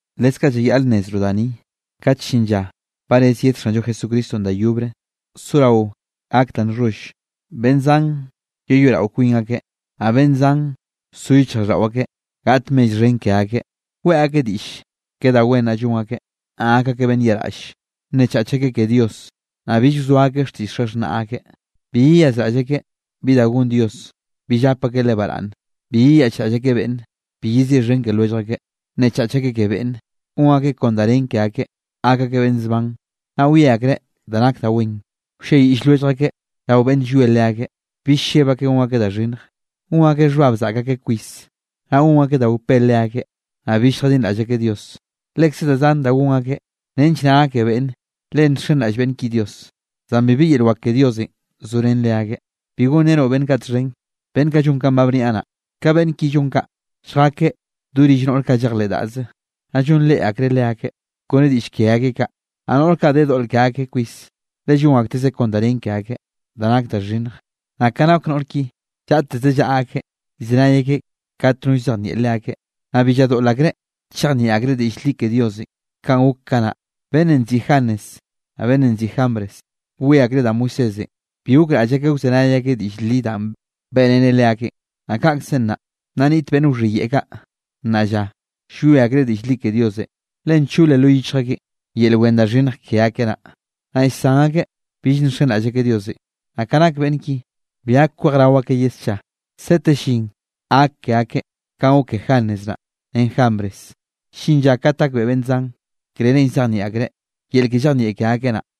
Leskaꞌ llayaꞌl nnezroꞌ da ni: kat llin lla ba rez yed Xanllo Jesucristonꞌ da yobre, sorao gak da nxholl. Beꞌnn zan yeyoeꞌrao kwin akeꞌ, naꞌ beꞌnn zan so yichjraꞌlldaꞌo akeꞌ gaꞌt mell xhen ke akeꞌ. Weꞌe akeꞌ diꞌll ke da wen naꞌ llon akeꞌ, naꞌ gak akeꞌ beꞌnn yaꞌraꞌlle. Nnechach akeꞌ ke Dios, naꞌ bill wzoa akeꞌ xtiꞌll xaxhnaꞌ akeꞌ. Bi yeyazraꞌll akeꞌ bi da gon Dios, bill gap akeꞌ Leꞌe baraꞌnne. Bi yeyaꞌchraꞌll akeꞌ beꞌnne, bi yeziꞌxhen ke lwellj akeꞌ, nnechach akeꞌ ke beꞌnne, gon akeꞌ kon da nen ke akeꞌ, gak akeꞌ beꞌnn zban, naꞌ wie akreꞌ da nak da wen. Wlliayiꞌll lwellj akeꞌ rao beꞌnne llwie leakeꞌ, bill lleb akeꞌ gon akeꞌ da xhinnj, gon akeꞌ xhbab zaꞌk akeꞌ kwis, naꞌ gon akeꞌ da wpé leakeꞌ, naꞌ bill lljadinraꞌll akeꞌ Dios. Lekze da zan da gon akeꞌ, nench naꞌ gake beꞌnne le nxenraꞌll beꞌnn ki Dios, zan bibi yel wak ke Diosenꞌ zorén leakeꞌ. Bi gonrenoꞌ beꞌnn kaꞌ txhen, beꞌnn kaꞌ llon kanꞌ ba bniaꞌ naꞌ. Ka beꞌnn ki llon kaꞌ, lljakeꞌ do rill noꞌr kaꞌ llejleꞌ daꞌze, naꞌ llonreꞌ akreꞌ leakeꞌ, kone diꞌll ke akeꞌ kaꞌ. Naꞌ noꞌr kaꞌ de doꞌl ke akeꞌ kwis, le llon aktezeꞌ kon da nen ke akeꞌ, da nak da xhinnj. Naꞌ ka nak noꞌr ki, llaꞌteze llaꞌa akeꞌ llzenay akeꞌ kat no llzejnieꞌ leakeꞌ, naꞌ bi lladoꞌl akreꞌ chejnieꞌ akreꞌ diꞌll li ke Diosenꞌ. Kanꞌ gok kanaꞌ, beꞌnnenꞌ nziꞌi Janes, naꞌ beꞌnnenꞌ nziꞌi Jambres, bwie akreꞌ da Moisésenꞌ, bi gokraꞌll akeꞌ wzenay akeꞌ diꞌll li danꞌ beꞌreneꞌ leakeꞌn, naꞌ kaꞌkzenꞌ nnaꞌ, nna niꞌt beꞌnn wxhiyeꞌe kaꞌ, nnaꞌ lla, llwie akreꞌ diꞌll li ke Diosenꞌ. Le nchole lo yichj akeꞌn yel wen da xhinnj ke akeꞌ naꞌ, naꞌ llsan akeꞌ bill nxenraꞌll akeꞌ Diosenꞌ. Naꞌ ka nak beꞌnn ki, bi gak kwejrao akeꞌ ye scha, sete llin gak ke akeꞌ kanꞌ gok ke Janes naꞌ ren Jambres, llin lla kat gakbeꞌe beꞌnn zan, krerenꞌ llzejnieꞌ akreꞌ yel ke llejnieꞌ ke akeꞌ naꞌ.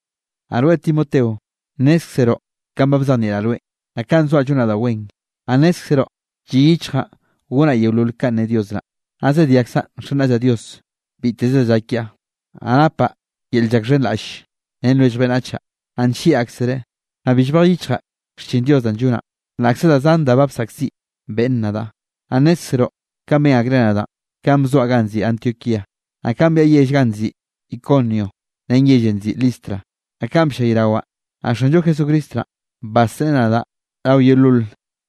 Naꞌ rweꞌ Timoteo, nnézkzeroꞌ kanꞌ ba bzejnieꞌraꞌ rweꞌn, naꞌ kanꞌ zoaꞌ llonaꞌ da wen. Naꞌ nnézkzeroꞌ lliꞌ yichjaꞌ gonaꞌ yeolol kanꞌ ne Dios naꞌ. Naꞌ zediakzaꞌ nxenraꞌllaꞌ Dios biteze da llak kiaꞌ. Naꞌ napaꞌ yel llakxhenraꞌll ren lwellj beꞌnnachaꞌ, naꞌ nllieꞌ aksereꞌ. Naꞌ bi llbej yichjaꞌ xchin Dios danꞌ llonaꞌ, laꞌkze da zan da bsaꞌkziꞌ beꞌnne nadaꞌ. Naꞌ nnézkzeroꞌ kanꞌ ben akreꞌ nadaꞌn, kanꞌ bzoaꞌ ganꞌ nziꞌi Antioquía, naꞌ kanꞌ byaꞌa yell ganꞌ nziꞌi Iconio ren yellenꞌ nziꞌi Listra, naꞌ kanꞌ bllayrawaꞌ. Naꞌ Xanllo Jesucristo naꞌ, basreꞌe nadaꞌ rao yeolol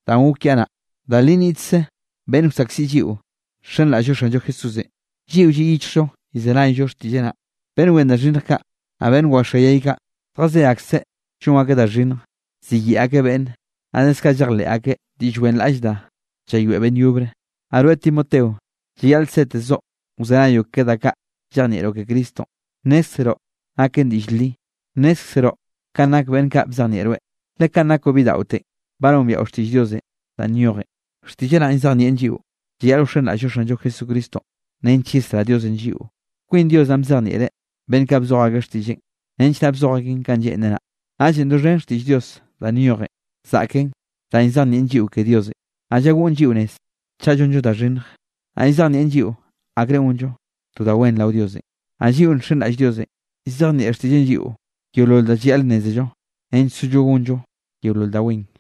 danꞌ gok kiaꞌ naꞌ. Da li nniꞌtkze beꞌnn wsaꞌkziꞌ lliꞌo nxenraꞌll-llo Xanllo Jesúsenꞌ, lliꞌo lliꞌ yichjllo llzenayllo xtiꞌlleꞌ naꞌ. Beꞌnn wen da xhinnj kaꞌ, naꞌ beꞌnn waxoayay kaꞌ, zjazé akseꞌ llon akeꞌ da xhinnjenꞌ, siyeꞌe akeꞌ beꞌnne, naꞌ leskaꞌ llejleꞌ akeꞌ ke diꞌll wenraꞌll da llayoeꞌ beꞌnn yobre. Naꞌ rweꞌ Timoteo, llayaꞌl setezoꞌ wzenayoꞌ ke da kaꞌ llejnieꞌroꞌ ke Cristonꞌ, nnézkzeroꞌ naken diꞌll li, nnezkeroꞌ kanꞌ nak beꞌnn kaꞌ bzejnieꞌ rweꞌ. Le kanꞌ nakoꞌ bidaꞌotenꞌ, ba nombiaꞌo xtiꞌll Diosenꞌ danꞌ nyojen. Xtiꞌlleꞌ naꞌn llzejnieꞌn lliꞌo llayaꞌl wxenraꞌll-llo Xanllo Jesucristo nench yesrá Diosenꞌ lliꞌo. Kwin Dios naꞌn bzejnieꞌreꞌ beꞌnn kaꞌ bzoj akeꞌ xtiꞌlleꞌn, nench naꞌ bzoj akeꞌn kanꞌ lleꞌnreꞌ naꞌ. Naꞌllenꞌ doxhen xtiꞌll Dios danꞌ nyojen, zaꞌken danꞌ llzejnieꞌn lliꞌo ke Diosenꞌ, naꞌ llagoꞌn lliꞌo nez chaꞌ llonllo da xhinnje, naꞌ llzejnieꞌn lliꞌo akrenꞌ gonllo to da wen rao Diosenꞌ. Naꞌ lliꞌo nxenraꞌll Diosenꞌ, llzejnieꞌ xtiꞌlleꞌn lliꞌo yeolol da llayaꞌl nnézello nench sollo gonllo yeolol da wen.